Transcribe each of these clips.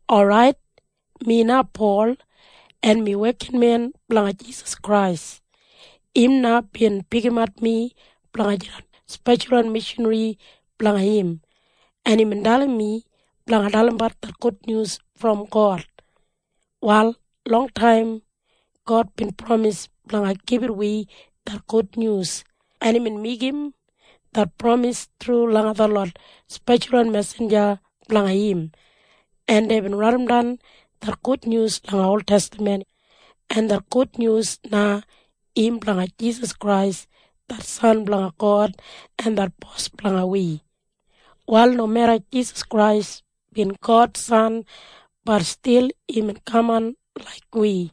Orait, mi na Pol, en mi wekinmen blanga Jisas Krais. Im na bin pikimat mi blanga jidan speshalwan mishanri blanga im, en imbin dalim mi blanga dalimbat det gudnyus brom God. Wal longtaim God bin pramis blanga gibit wi det gudnyus, en imbin meigim det pramis thru langa detlot speshalwan mesinja blanga im, en deibin raidimdan det gudnyus langa oltestaman, en det gudnyus na im blanga Jisas Krais det San blanga God en det Bos blanga wi. Wal nomeda Jisas Krais bin God San, bat stil imbin kaman laik wi,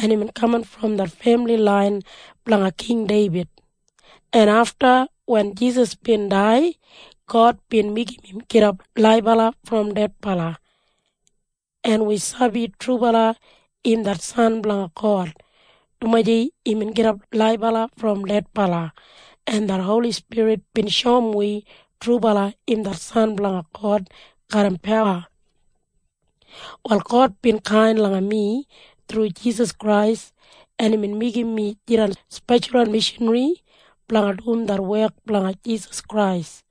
en imbin kaman brom det femili lain blanga King Deibid, en afta wen Jisas bin dai, God bin meigim im gidap laibala brom dedbala. En wi sabi trubala im det San blanga God, dumaji imbin gidap laibala brom dedbala, en det Holi Spirit bin shoum wi trubala im det San blanga God garram pawa. Wal God bin kain langa mi thru Jisas Krais, en imbin meigim mi jidan speshalwan mishanri blanga dum det wek blanga Jisas Krais,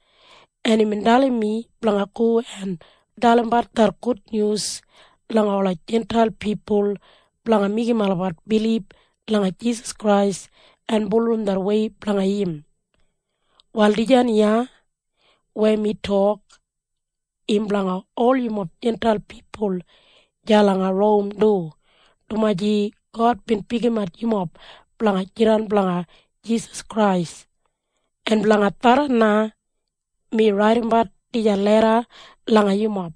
en imbin dalim mi blanga go en dalimbat det gudnyus langa ola Jintail pipul blanga meigim olabat bilib langa Jisas Krais en bulurrum det wei blanga im. Wal dijan iya weya mi tok, im blanga ol yumob Jintail pipul deya langa Rom du, dumaji God bin pikimat yumob blanga jidan blanga Jisas Krais. En blanga tharran na mi raidimbat dijan leda langa yumob,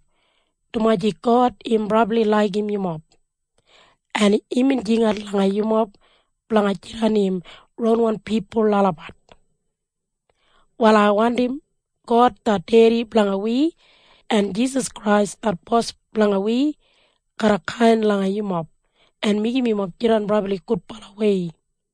dumaji God im brabli laigim yumob, en imbin jingat langa yumob blanga jidan im ronwan pipul olabat. Wal ai wandim God det Dedi blanga wi, en Jisas Krais det Bos blanga wi garra kain langa yumob, en meigim yumob jidan brabli gudbalawei.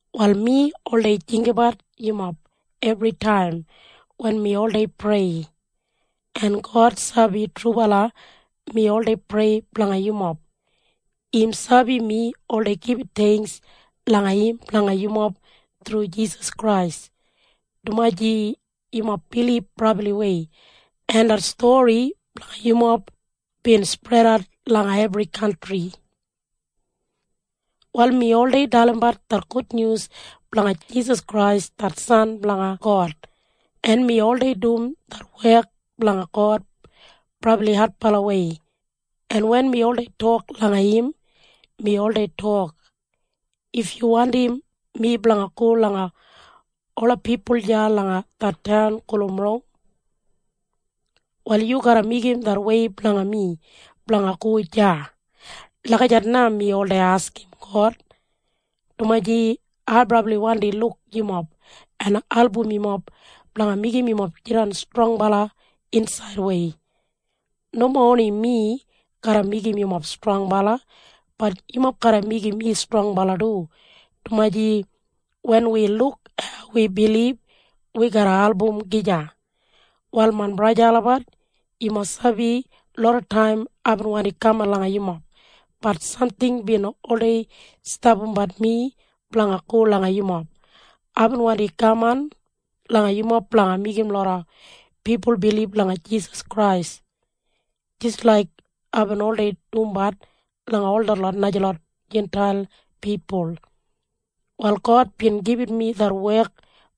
Wal mi oldei jinggabat yumob ebritaim wen mi oldei prei. En God sabi trubala mi oldei prei blanga yumob. Im sabi mi oldei gibit theingks langa im blanga yumob thru Jisas Krais, dumaji yumob bilib brabliwei, en det stori blanga yumob bin spredat langa ebri kantri. Wal mi oldei dalimbat det gudnyus blanga Jisas Krais det San blanga God, en mi oldei dum det wek blanga God brabli adbalawei. En wen mi oldei tok langa im, mi oldei tok, “If yu wandim mi blanga go langa ola pipul deya langa det taun gulum Rom, wal yu garra meigim det wei blanga mi blanga go deya.” Lagijat na mi oldei askim God, dumaji ai brabli wandi luk yumob en album yumob blanga meigim yumob jidan strongbala insaidwei. Nomo oni mi garra meigim yumob strongbala, bat yumob garra meigim mi strongbala du, dumaji wen wi luk hau wi bilib, wi garra album gija. Wal main braja en sista olabat, yumob sabi lodataim aibin wandi kaman langa yumob, bat samting bin oldei stapambat mi blanga go langa yumob. Aibin wandi kaman langa yumob blanga meigim loda pipul bilib langa Jisas Krais jis laik aibin oldei dumbat langa ol detlot najalot Jintail pipul. Wal God bin gibit mi det wek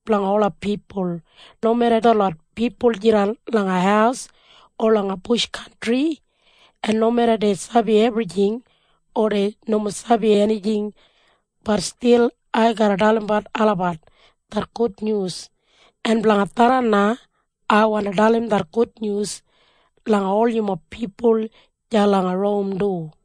blanga ola pipul. Nomeda detlot pipul jidan langa haus o langa bush kantri, en nomeda dei sabi ebrijing o dei nomo sabi enijing, bat stil ai garra dalimbat olabat det gudnyus. En blanga tharran na ai wandi dalim det gudnyus langa ol yumob pipul deya langa Rom du.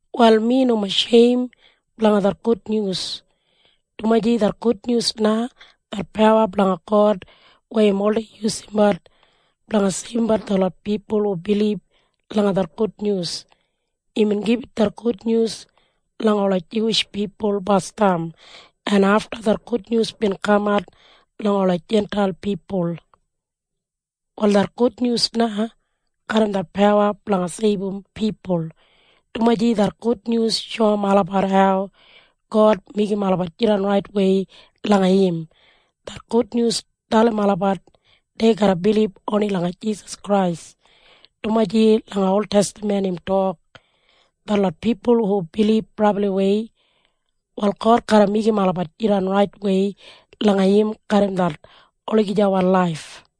Wal mi nomo sheim blanga det gudnyus, dumaji det gudnyus na det pawa blanga God weya im oldei yusumbat blanga seibumbat detlot pipul hu bilib langa det gudnyus. Imbin gibit det gudnyus langa ola Juwish pipul basdam, en afta det gudnyus bin kamat langa ola Jintail pipul. Wal det gudnyus na garram det pawa blanga seibum pipul, dumaji det gudnyus shoum olabat hau God meigim olabat jidan raitwei langa im. Det gudnyus dalim olabat dei garra bilib oni langa Jisas Krais. Dumaji langa oltestaman im tok, “Detlot pipul hu bilib brabliwei, wal God garra meigim olabat jidan raitwei langa im garram det olagijawan laif.”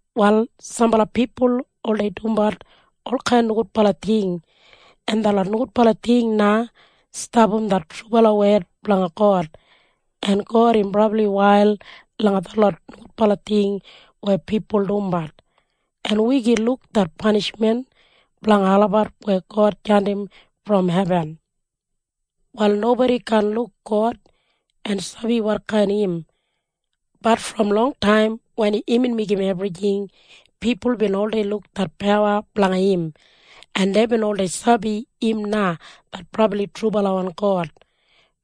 Wal sambala pipul oldei dumbat olkain nogudbala ting, en detlot nogudbala ting na stapam det trubala wed blanga God, en God im brabli wail langa ol detlot nogudbala ting weya pipul dumbat, en wi gin luk det panishmen blanga olabat weya God jandim brom hebin. Wal nobodi kaan luk God en sabi wotkain im. Bat brom longtaim wen imbin meigim ebrijing, pipul bin oldei luk det pawa blanga im, en deibin oldei sabi im na det brabli trubalawan God,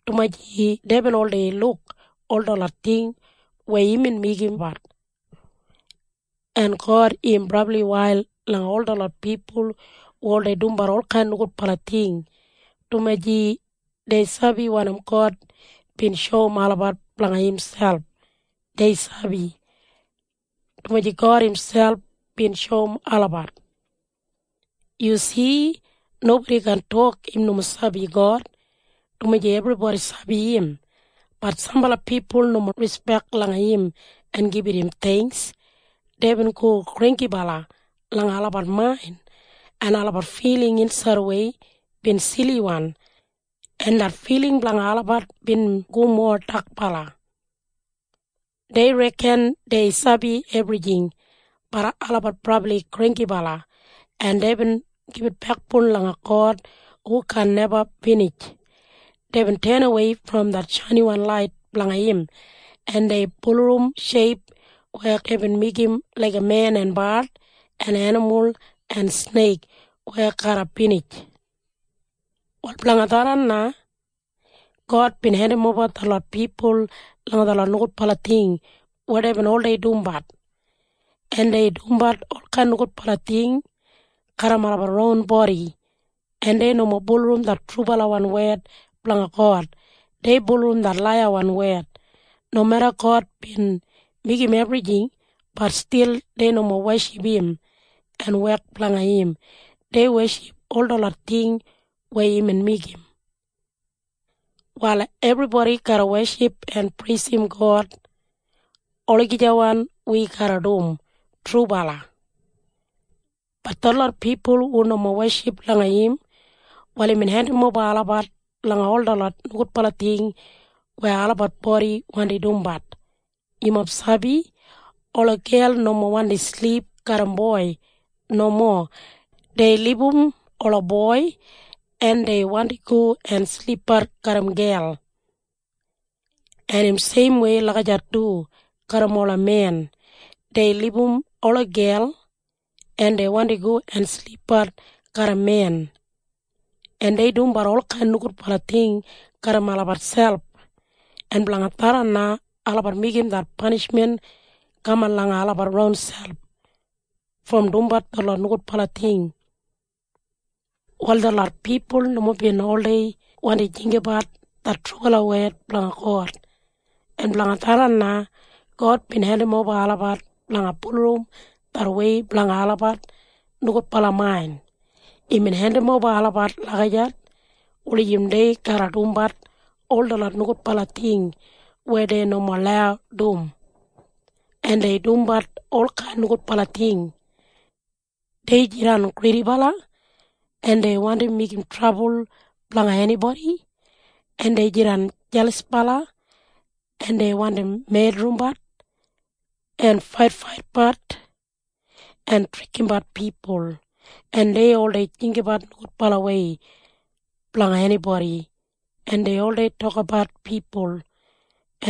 dumaji deibin oldei luk ol detlot ting weya imbin meigimbat. En God im brabli wail langa ol detlot pipul hu oldei dumbat olkain nogudbala ting, dumaji dei sabi wanim God bin shoum olabat blanga imselp. Dei sabi, dumaji God imselp bin shoum olabat. Yu si? Nobodi kaan tok im nomo sabi God, dumaji ebribodi sabi im. Bat sambala pipul nomo rispek langa im en gibit im theingks. Deibin go granggibala langa olabat main, en olabat filing insaidwei bin siliwan, en det filing blanga olabat bin go mowa dakbala. Dei reken dei sabi ebrijing. Bat olabat brabli granggibala, en deibin gibit bekboun langa God hu kaan neba binij. Deibin tenawei brom det shainiwan lait blanga im, en dei bulurrum sheip weya deibin meigim laiga men en bard en enimul en sneik weya garra binij. Wal blanga tharran na God bin hendimoba detlot pipul langa detlot nogudbala ting weya deibin oldei dumbat, en dei dumbat olkain nogudbala ting garram olabat ron bodi, en dei nomo bulurrum det trubalawan wed blanga God, dei bulurrum det laiyawan wed. Nomeda God bin meigim ebrijing, bat stil dei nomo weship im en wek blanga im. Dei weship ol detlot ting weya imbin meigim. Wal ebribodi garra weship en preisim God. Olagijawan wi garra dum. Trubala. Bat detlot pipul hu nomo weship langa im, wal imbin hendimoba olabat langa ol detlot nogudbala ting weya olabat bodi wandi dumbat. Yumob sabi? Ola gel nomo wandi silip garram boi. Nomo. Dei libum ola boi, en dei wandi go en silipbat garram gel. En im seimwei lagijat du garram ola men. Dei libum ola gel, en dei wandi go en silipbat garram men, en dei dumbat olkain nogudbala ting garram olabat selp. En blanga tharran na olabat meigim det panishmen kaman langa olabat ronselp brom dumbat detlot nogudbala ting. Wal detlot pipul nomo bin oldei wandim jinggabat det trubala wed blanga God, en blanga tharran na God bin hendimoba olabat blanga bulurrum det wei blanga olabat nogudbala main. Imbin hendimoba olabat lagijat wulijim dei garra dumbat ol detlot nogudbala ting weya dei nomo lau dum, en dei dumbat olkain nogudbala ting. Dei jidan gridibala, en dei wandim meigim trabul blanga enibodi, en dei jidan jelasbala, en dei wandim medrimbat, en faitfaitbat, en trikimbat pipul, en dei oldei jinggabat nogudbalawei blanga enibodi, en dei oldei tokabat pipul,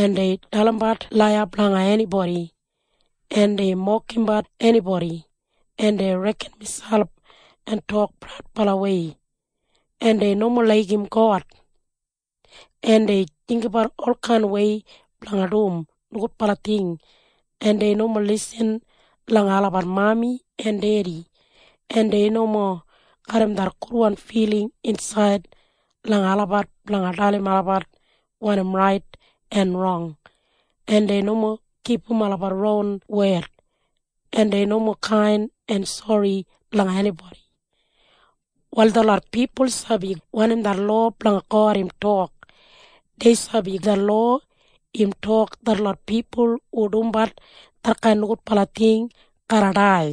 en dei dalimbat laiya blanga enibodi, en dei mokimbat enibodi, en dei reken miselp en tok praudbalawei, en dei nomo laigim God, en dei jinggabat olkainwei blanga dum nogudbala ting, en dei nomo lisin langa olabat mami en dedi, en dei nomo garram det gudwan filing insaid langa olabat blanga dalim olabat wanim rait en rong, en dei nomo kipum olabat ron wed, en dei nomo kain en sori langa enibodi. Wal detlot pipul sabi wanim det lowa blanga God im tok. Dei sabi det lowa im tok detlot pipul hu dumbat detkain nogudbala ting garra dai.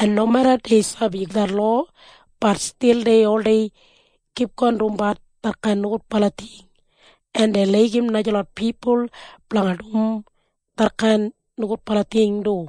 En nomeda dei sabi det lowa, bat stil dei oldei kipgon dumbat detkain nogudbala ting, en dei laigim najalot pipul blanga dum detkain nogudbala ting du.